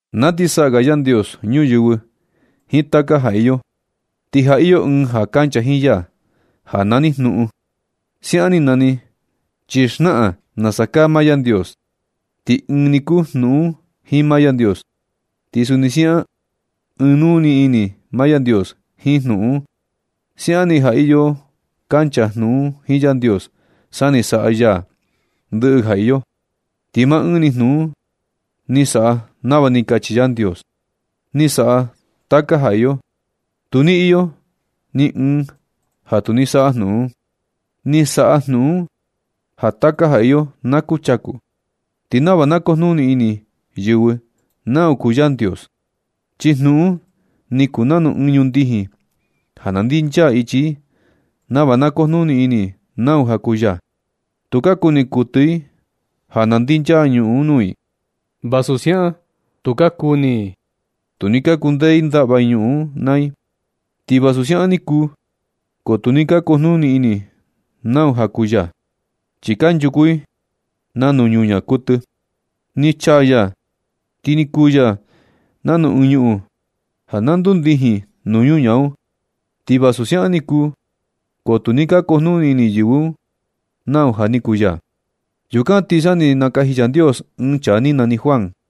Na ti saꞌa ga Yandios ñuyɨvɨ jiin taka ga iyo, ti ja iyo Ɨɨn ja kancha jiin ya ja nani Jnuꞌun. Siaꞌan ni nani chi xnaꞌan nasa kaa maa Yandios. Ti ɨɨn ni kuu Jnuꞌun un jiin maa Yandios. Ti suni siaꞌan ɨɨn nuu ini maa Yandios jiin Jnuꞌun un. Siaꞌan ni ja iyo kancha Jnuꞌun un jiin Yandios sa ni saꞌa ya ndɨꞌɨ ga ja iyo. Ti maa ɨɨn ni Jnuꞌun un ni saꞌa nava ni kachi Yandios, ni saꞌa taka ja iyo. Tu ni iyo ni ɨɨn ja tu ni saꞌa Jnuꞌun un. Ni saꞌa Jnuꞌun un ja taka ja iyo na kuchaku. Ti nava na kujnuni ini yɨvɨ nau kuu Yandios, chi Jnuꞌun un ni kuu nanu ɨɨn ñundijin ja na ndinchaa ichi i nava na kujnuni ini i nau ja kuu ya. Tu ka kuni kuɨtɨ i ja na ndinchaa ñuꞌun un nuu i. Vasu siaꞌan tu ka kuni i tu ni ka kundee i ndaꞌva i ñuꞌun un naa i. Ti vasu siaꞌan ni kuu, ko tu ni ka kujnuni ini i nau ja kuu ya, chi kanchuku i nanu ñuñaa kuɨtɨ. Ni chaa ya ti ni kuu ya nanu ɨɨn ñuꞌun ja na ndundijin nuu ñaa un. Ti vasu siaꞌan ni kuu ko tu ni ka kujnuni ini yɨvɨ nau ja ni kuu ya. Yukan ti sa ni nakaji Yandios ɨɨn chaa ni nani Juan,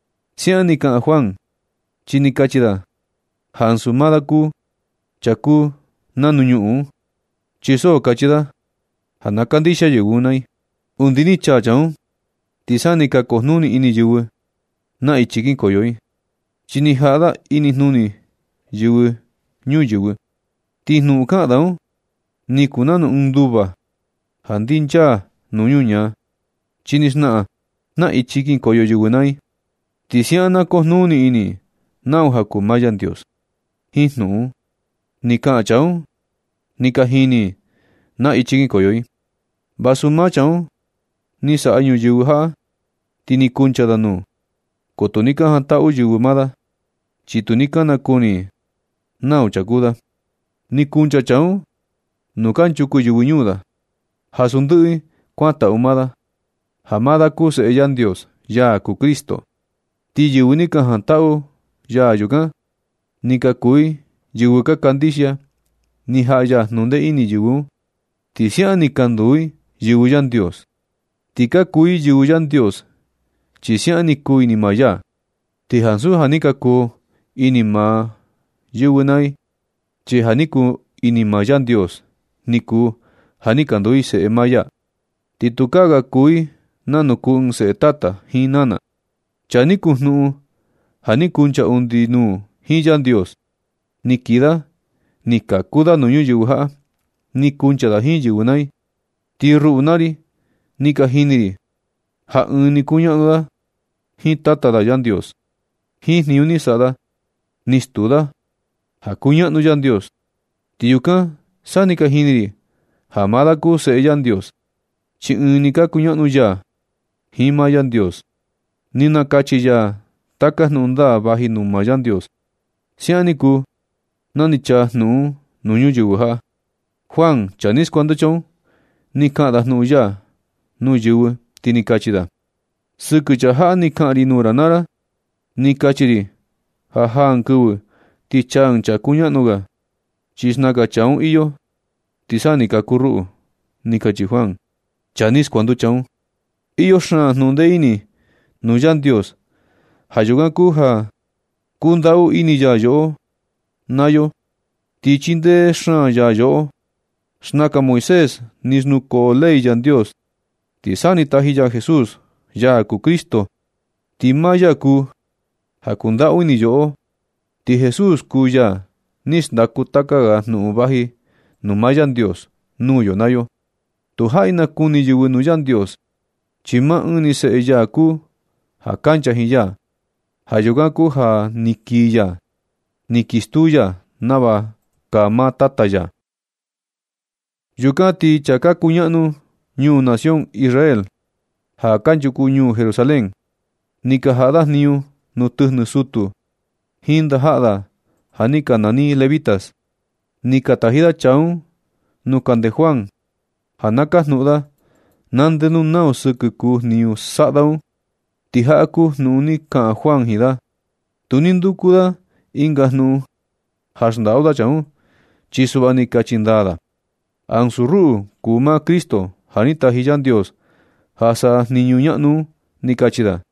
Siaꞌan ni kaꞌan Juan chi ni kachi da ja ansu maa da kuu Chaa kuu nanu ñuꞌun un, chi so kachi da ja na kandixia yɨvɨ naa i. Undi ni chaa Chaa un, ti sa ni ka kujnuni ini yɨvɨ naa ichi kinkoyo i, chi ni jaꞌa da inijnuni yɨvɨ ñuyɨvɨ. Ti jnuꞌun kaꞌan da un, ni kuu nanu ɨɨn nduva ja ndinchaa nuu ñuñaa. Chi ni xnaꞌan naa ichi kinkoyo yɨvɨ naa i. Ti siaꞌan na kujnuni ini i nau ja kuu maa Yandios. Jiin jnuꞌun ni kaꞌan chaa un, ni ka jini i naa ichi kinkoyo i. Vasu maa Chaa un ni saꞌa ñuyɨvɨ jaꞌa ti ni kuncha da nuu, ko tu ni ka jantaꞌu yɨvɨ maa da. Chi tu ni ka nakuni i nau chaa kuu da. Ni kuncha Chaa un nuu kanchuku yɨvɨ ñuu da, ja su ndɨꞌɨ i kuantaꞌu maa da, ja maa da kuu Seꞌe Yandios, ya kuu Cristo. Ti yɨvɨ ni ka jantaꞌu ya yukan, ni ka kuu i yɨvɨ ka kandixia. Ni jaꞌa ya jnundee ini yɨvɨ un, ti siaꞌan ni ka nduu i yɨvɨ Yandios. Ti ka kuu i yɨvɨ Yandios, chi siaꞌan ni kuu ini maa ya. Ti ansu ja ni ka kuu ini maa yɨvɨ naa i, chi ja ni kuu ini maa Yandios ni kuu ja ni ka nduu i seꞌe maa ya, ti tukaa ga kuu i nanu kuu ɨɨn seꞌe tata jiin nana. Chaa ni kuu Jnuꞌun ja ni kuncha undi nuu jiin Yandios un, ni kii da ni kaku da nuu ñuyɨvɨ jaꞌa. Ni kuncha da jiin yɨvɨ naa i, ti ruꞌu naa ri ni ka jini ri ja ɨɨn ni kuñaꞌnu da jiin Tata da Yandios. Jiin jniñu ni saꞌa da ni stuu da ja kuñaꞌnu Yandios. Ti yukan sa ni ka jini ri ja maa da kuu Seꞌe Yandios, chi ɨɨn ni ka kuñaꞌnu ya jiin maa Yandios. Ni nakachi ya taka jnuꞌun ndaa vaji nuu maa Yandios. Siaꞌan ni kuu na ni chaa Jnuꞌun un nuu ñuyɨvɨ jaꞌa. Juan, chaa ni skuanducha un, ni kaꞌan da jnuꞌun ya nuu yɨvɨ, ti ni kachi da: ―Sɨkɨ Chaa jaꞌa ni kaꞌan ri nuu ra naa ra na, ni kachi ri ja jaa ɨɨn kɨvɨ ti chaa ɨɨn Chaa kuñaꞌnu ga, chi xnaka Chaa un iyo, ti sa ni kaku ruꞌu ―ni kachi Juan, chaa ni skuanducha un. Iyo xaan jnuꞌun ndee ini nuu ya nuu Yandios. Ja yukan kuu ja kundaꞌu ini ya yoꞌo naa yo, ti chindee xaan ya yoꞌo. Xnaka Moisés ni xnukoo ley Yandios, ti sa ni taji ya Jesús, ya kuu Cristo, ti maa ya kuu ja kundaꞌu ini yoꞌo. Ti Jesús kuu ya ni xndaku taka ga jnuꞌun vaji nuu maa Yandios nuu yo naa yo. Tu jaꞌi nakuni yɨvɨ nuu Yandios, chi maa ɨɨn ni seꞌe ya kuu ja kancha jiin ya. Ja yukan kuu ja ni kii ya, ni kii stuu ya nava kaa maa Tata ya. Yukan ti chaa ka kuñaꞌnu nuu nación Israel, ja kanchuku ñuu Jerusalén, ni ka jaꞌa da jniñu nuu tɨjnɨ sutu jiin ndajaꞌa da ja ni ka nani levitas. Ni ka taji da chaa un nuu kande Juan ja na kajnuꞌun da, na ndenu nau sɨkɨ kuu jniñu saꞌa da un. Ti jaꞌa kuu jnuꞌun ni kaꞌan Juan jiin da. Tu ni nduku da ɨnga jnuꞌun ja xndaꞌu da chaa un, chi suꞌva ni kachi ndaa da: ―Ansu ruꞌu kuu maa Cristo ja ni taji Yandios ja saꞌa jniñu ñaꞌnu un ―ni kachi da.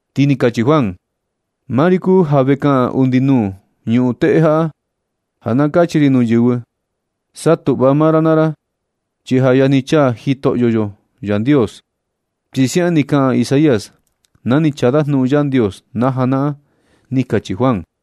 Ti ni kachi Juan: ―Maa ri kuu ja ve kaꞌan undi nuu ñuꞌun teꞌe jaꞌa, ja na kachi ri nuu yɨvɨ: “Satuꞌva maa ra naa ra, chi ja yajni chaa Jitoꞌyo Yandios”, chi siaꞌan ni kaꞌan Isaías na ni chaa da jnuꞌun Yandios na janaꞌan―ni kachi Juan.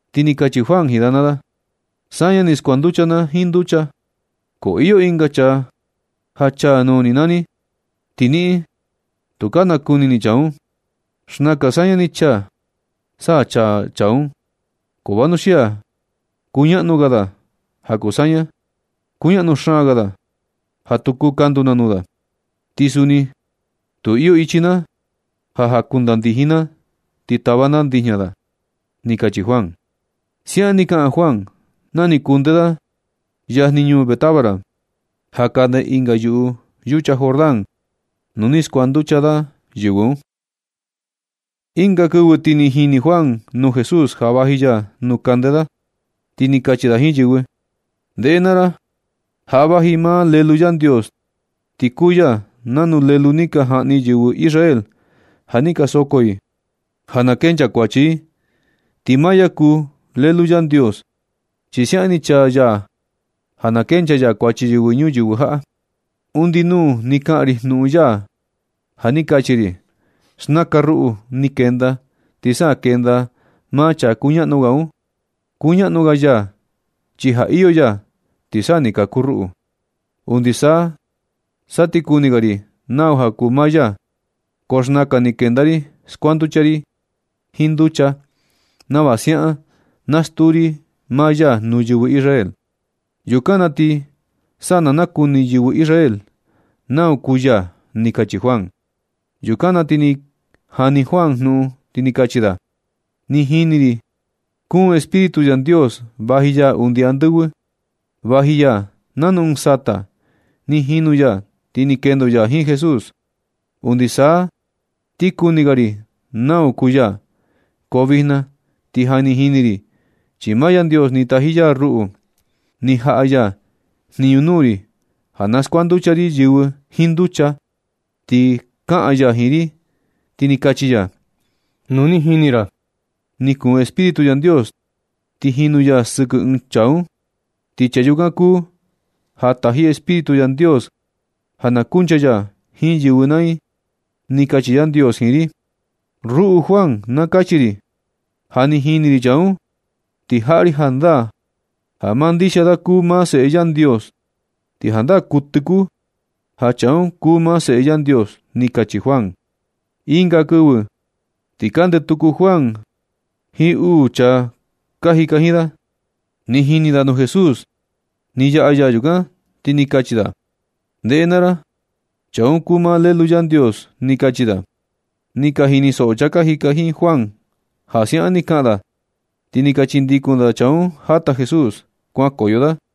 Ti ni kachi Juan jiin da naa da: ―Saña chi skuanducha na jiin nducha, ko iyo ɨnga Chaa ja chaa nuu ni naa ni, ti niꞌin, tu ka nakuni ni chaa un. Xnaka saña ni chaa, sa chaa Chaa un. Ko vanuxia kuñaꞌnu ga da ja kuu saña. Kuñaꞌnu xaan ga da ja tu kuu kandu na nuu da, ni ansu jniñu na kuu jakuitandijin na ti tava na ndijña da ―ni kachi Juan. Siaꞌan ni kaꞌan Juan na ni kunde da yajni ñuu Betábara, ja kande ɨnga yuꞌu yucha Jordán nu ni skuanducha da yɨvɨ un. Ɨnga kɨvɨ ti ni jini Juan nuu Jesús ja vaji ya nuu kande da, ti ni kachi da jiin yɨvɨ: ―Ndeꞌe naa ra, jaꞌa vaji maa Lelu Yandios, ti kuu ya nanu lelu ni ka jaꞌni yɨvɨ Israel ja ni ka soko i ja na kencha kuachi i. Ti maa ya kuu Lelu Yandios, chi siaꞌan ni chaa ya ja na kencha ya kuachi yɨvɨ ñuyɨvɨ jaꞌa. Undi nuu ni kaꞌan ri jnuꞌun ya ja ni kachi ri: “Xnaka ruꞌu, ni kenda ti sa kenda maa Chaa kuñaꞌnu ga un. Kuñaꞌnu ga ya chi ja iyo ya, ti sa ni kaku ruꞌu. Undi na sa ti kuni ga ri nau kuu maa ya. Ko xnaka ni kenda ri skuanducha ri jiin nducha nava siaꞌan na stuu ri maa ya nuu yɨvɨ Israel. Yukan na ti sa na nakuni yɨvɨ Israel nau kuu ya” ―ni kachi Juan. Yukan na ti ni jani Juan jnuꞌun, ti ni kachi da: ―Ni jini ri ni kuun Espíritu Yandios vaji ya undi andɨvɨ, vaji ya nanu ɨɨn sata, ni jinu ya ti ni kendo ya jiin Jesús. Undi sa ti kuni ga ri nau kuu ya, ko vijna ti ja ni jini ri chi maa Yandios ni taji ya ruꞌu. Ni jaꞌa ya jniñu nuu ri ja na skuanducha ri yɨvɨ jiin nducha. Ni kaꞌan ya jiin ri, ti ni kachi ya: “Nu ni jini ra ni kuun Espíritu Yandios ti jinu ya sɨkɨ ɨɨn chaa un. Ti Chaa yukan kuu ja taji Espíritu Yandios ja na kuncha ya jiin yɨvɨ naa i”, ni kachi Yandios jiin ri. Ruꞌu Juan, na kachi ri ja, ja ni jini ri Chaa un, ti jaꞌa ri jandaa ja maa ndixia da kuu maa Seꞌe Yandios. Ti jandaa kuɨtɨ kuu ja Chaa un kuu maa Seꞌe Yandios ―ni kachi Juan. Ɨnga kɨvɨ ti kande tuku Juan jiin uu chaa ka jika jiin da. Ni jini da nuu Jesús ni yaꞌa ya yukan, ti ni kachi da: ―Ndeꞌe naa ra, Chaa un kuu maa Lelu Yandios ―ni kachi da. Ni ka jinisoꞌo chaa ka jika jiin Juan ja siaꞌan ni kaꞌan da, ti ni ka chindikun chaa un jata Jesús kuankoyo da.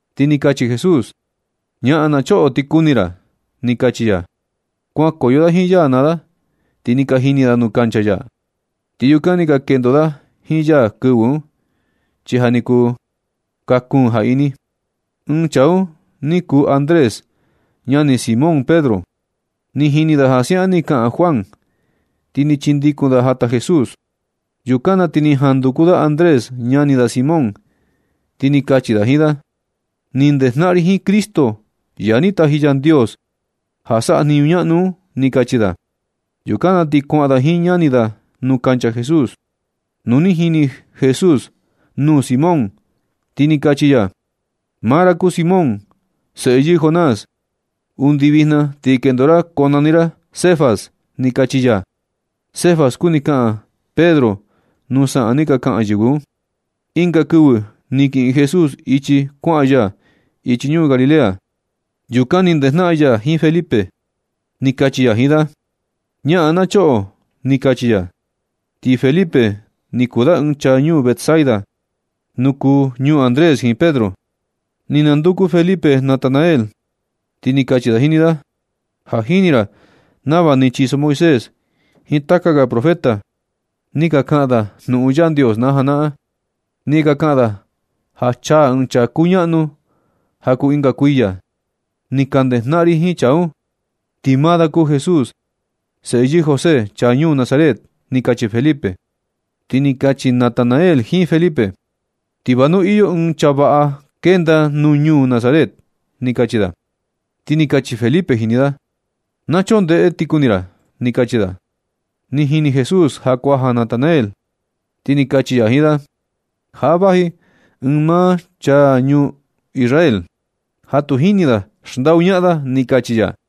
Ti ni kachi Jesús: ―Ñaꞌan na choꞌo, ti kuni ra ―ni kachi ya. Kuankoyo da jiin ya naa da ti ni ka jini da nuu kancha ya. Ti yukan ni ka kendo da jiin ya kɨvɨ un, chi ja ni kuu kaa kuun ja ini. Ɨɨn chaa un ni kuu Andrés, ñani Simón Pedro. Ni jini da ja siaꞌan ni kaꞌan Juan, ti ni chindikun da jata Jesús. Yukan na ti ni jan nunduku Andrés ñani da Simón Pedro, ti ni kachi da jiin da: ―Ni nakejnaꞌan ri jiin Cristo, ya ni taji Yandios ja saꞌa jniñu ñaꞌnu un ―ni kachi da. Yukan na ti kuaꞌan da jiin ñani da nuu kancha Jesús. Nu ni jini Jesús nuu Simón, ti ni kachi ya: ―Maa ra kuu Simón, seꞌe yɨɨ Jonás. Undi vijna ti kendo ra konani ra Cefas ―ni kachi ya. (Cefas kuni kaꞌan Pedro nuu saꞌan ni ka kaꞌan yɨvɨ un.) Ɨnga kɨvɨ ti ni kiꞌin Jesús ichi kuaꞌan ya ichi ñuu Galilea. Yukan ni ndejnaꞌan ya jiin Felipe. Ni kachi ya jiin da: ―Ñaꞌan na choꞌo ―ni kachi ya. Ti Felipe ni kuu da ɨɨn chaa ñuu Betsaida, nu kuu ñuu Andrés jiin Pedro. Ni nanduku Felipe Natanael, ti ni kachi da jini da: ―Ja jini ra nava ni chiso Moisés jiin taka ga profeta ni ka kaꞌan da jnuꞌun Yandios na janaꞌan. Ni ka kaꞌan da ja chaa ɨɨn chaa kuñaꞌnu ja kuu ɨnga kuiya. Ni ka ndejnaꞌan ri jiin chaa un, ti maa da kuu Jesús, seꞌe yɨɨ José, chaa ñuu Nazaret ―ni kachi Felipe. Ti ni kachi Natanael jiin Felipe: ―Ti va nu iyo ɨɨn chaa vaꞌa kenda nuu ñuu Nazaret ―ni kachi da. Ti ni kachi Felipe jini da: ―Na choꞌo, ndeꞌe ti kuni ra ―ni kachi da. Ni jini Jesús ja kuaja Natanael, ti ni kachi ya jiin da: ―Jaꞌa vaji ɨɨn maa chaa ñuu Israel ja tu jini da xndaꞌu ñaꞌan da ―ni kachi ya.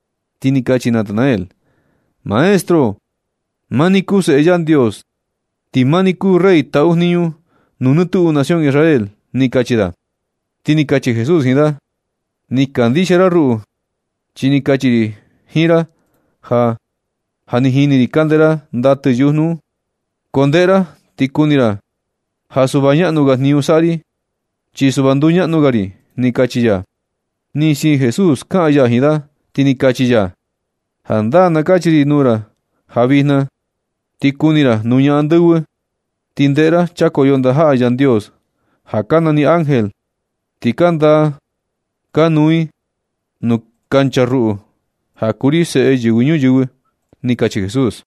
Ti ni kachi Natanael: ―Maestro, maa ni kuu Seꞌe Yandios. Ti maa ni kuu rey taꞌu jniñu nuu nɨ tuꞌu nación Israel ―ni kachi da. Ti ni kachi Jesús jiin da: ―Ni kandixia ra ruꞌu chi ni kachi ri jiin ra ja, ja ni jini ri kande ra ndatɨ yujnu un. Ko ndeꞌe ra ti kuni ra ja suꞌva naꞌnu ga jniñu saꞌa ri, chi suꞌva nduñaꞌnu ga ri ―ni kachi ya. Ni siin Jesús kaꞌan ya jiin da, ti ni kachi ya: ―Jandaa na kachi ri nuu ra ja vijna na ti kuni ra nuña andɨvɨ, ti ndeꞌe ra chakoyo ndajaꞌa Yandios (ja ka nani ángel), ti ka ndaa ka nuu i nuu kancha ruꞌu, ja kuu ri seꞌe Yɨvɨ Ñuyɨvɨ jaꞌ ―ni kachi Jesús.